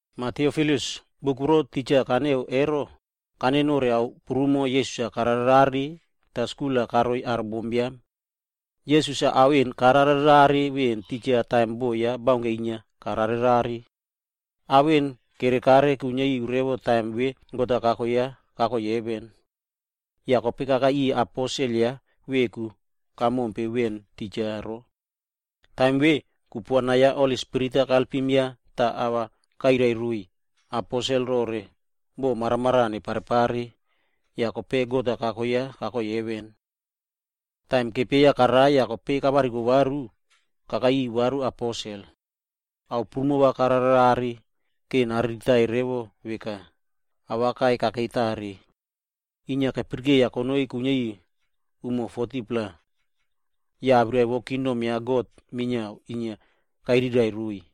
Mah Tiofilus, buk voro titja kaneꞌea vero, ero kaneꞌe nore ao prumo Jisas-a kararerare tah skul-a karoi aro bombiam. Jisas-a ao vemo kararerare titja veꞌen taim boꞌo ya baunke inia karao. Ao vemona kerekare kuiniari revo taim vemona God-a kako ya kakoi heven. Yah kope kakai riꞌiy aposel ya veku kamompe veꞌen titja ero. Taim vemona, kupuana vo Holi Spirit koalpim ya tah ava kairai roiy aposelb rore boꞌo maramaraꞌa va neparepare, yah kope God-a kako ya yah kakoi heven. Taim kepieya karai yah kope kavariko varu, kope kakai riꞌiy varu aposel. Ao prumo kararerare vora nariritai revo veka, awaka kakei tare. Inia keyaraka charara konoi kuiniari revo 40-pla umo, yah awirai vo kingdom ya God minia inia kairiraiꞌvo roiy.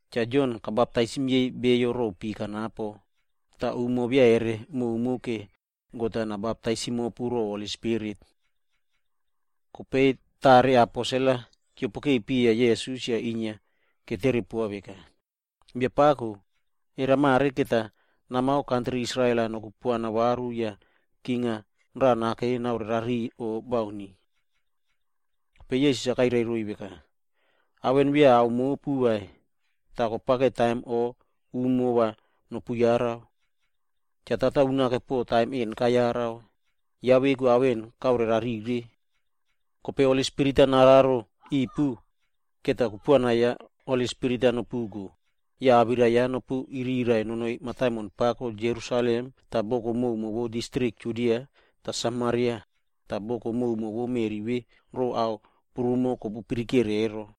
Cha Jon kabaptaisim yei beyo ro pi kanapo, kope umo beya koprumo vai va God-a nabaptaisim mopu ro Holi Spirit.” Kope tare vova aposel-a keopokeke piya Jisas tah inia ketere poa veka, “Biapako, era mare va namao kantri Israel-a nokupuana varu yah king vo raꞌa nakei vora naorerari o bauni?” Kope Jisas-a kairai roiy veka, “Ao vemona, beya ao mopu vai, tah kopao taim o umo vo nopuyara. Cha Kan unake taim vemo kayara, tah ya veku ao vemona kaorerarire. Toh kope va Holi Spirit-a noraro ripu, yah kupuana vo Holi Spirit-e va nopuko yah awirai-a nopuiriraiꞌvo nonoi mataimon pako Jerusalem awere boko prumo vo distrik Judia re Samaria, tah boko koka vo meꞌri vemo rore ao koka kopuyarare ero.”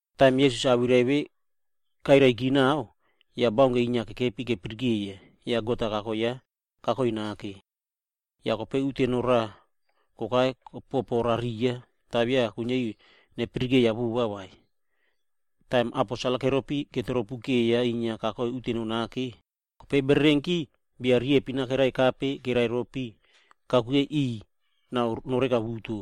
Taim Jisas-a awirai vemo kairaiki naꞌao, yah baunke inia kekepi ine inia kepirikeiya, yah God-a kako ya kakoi nake. Yah kope akron-a raꞌa kokai kopoporariya, tah beya kuiniari nepirikeiya vova vai. Taim aposel-a keropi yah ine ketropukeya inia kakoi uteno nake, kope bererenki bia riyempin kerekape kereropi piꞌiy kakuke nao noreka buso buso.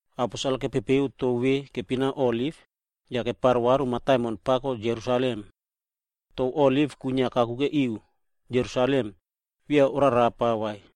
Aposel-a kepepeu tou vemona kepina Oliv, yah keparo varu mataimon pako Jerusalem. Tou Oliv kwinia kakuke ri Jerusalem, beya korarapa vai.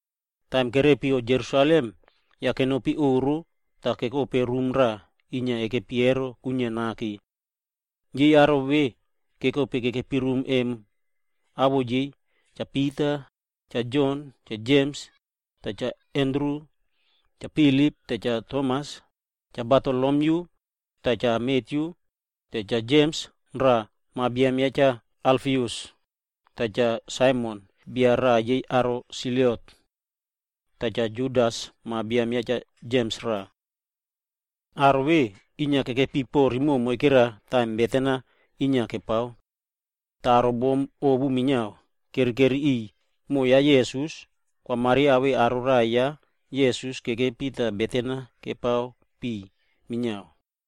Taim kerepika Jerusalem, yah kenopi oꞌro tah kekope rum raꞌa inia kekepi emo, kwinia nake.d Aro vemona kekope kekepi rum emo, awoꞌo yei em: Cha Pita, Cha Jon, Cha Jems yah Cha Andru, Cha Filip yah Cha Tomas, Cha Bartolomyu yah Cha Matyu, tah ya Cha Jems raꞌa (ma biam ya Cha Alfius) yah Cha Saimon (bia raꞌa yei aro Selot).e Yah Cha Judas, ma biam ya Cha Jems raꞌa. Aro vemona yei kekepi rimoꞌo moike kanapo taim beten-a inia kepao. Yah aro bom ovu minia kerekeri riꞌiy, moꞌo ya Jisas, Kwa Maria tah yei aro raꞌai ya Jisas kekepi tah beten-a kepao piꞌiy minia.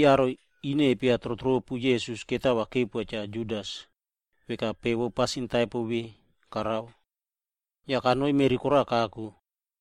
(Aro ine kepiatrotropu Jisas ero mani kepoa Cha Judas, veka pe vo pasin taipo vemona karao vemo. Yah kanoi meꞌri koraꞌa kako.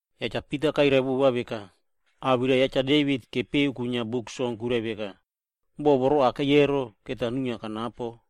Yah Cha Pita kairai vova veka, “Awirai ya Cha Devit kepeꞌe kwinia Buk Song kwirai veka, ‘Boꞌo voro kakei ero, va nuinia kanapo,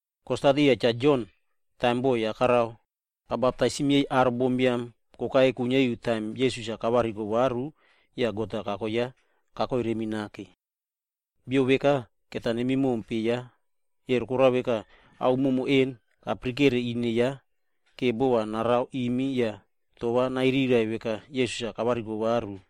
kostat riya Cha Jon taim boꞌo ya karao, kabaptaisim yei aro bombiam kokai kuiniari revo taim Jisas-a kavariko varu yah God-a kako ya kakoi remi nake. Bia vekaemo va nemi mompe, emo koraka, ao prumo kapirikere ine ya, vora bova narao rimi yah awirai ya Jisas-a nairiraiꞌvo veka Jisas-a kavariko varu.”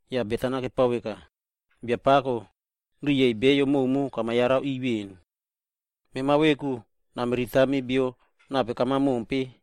Yah beten-a kepao veka, “Biapako, mema rimoꞌo kuro yei beyo prumo kamayarare veꞌen. Mema veku namiritami bia nape kama mompe,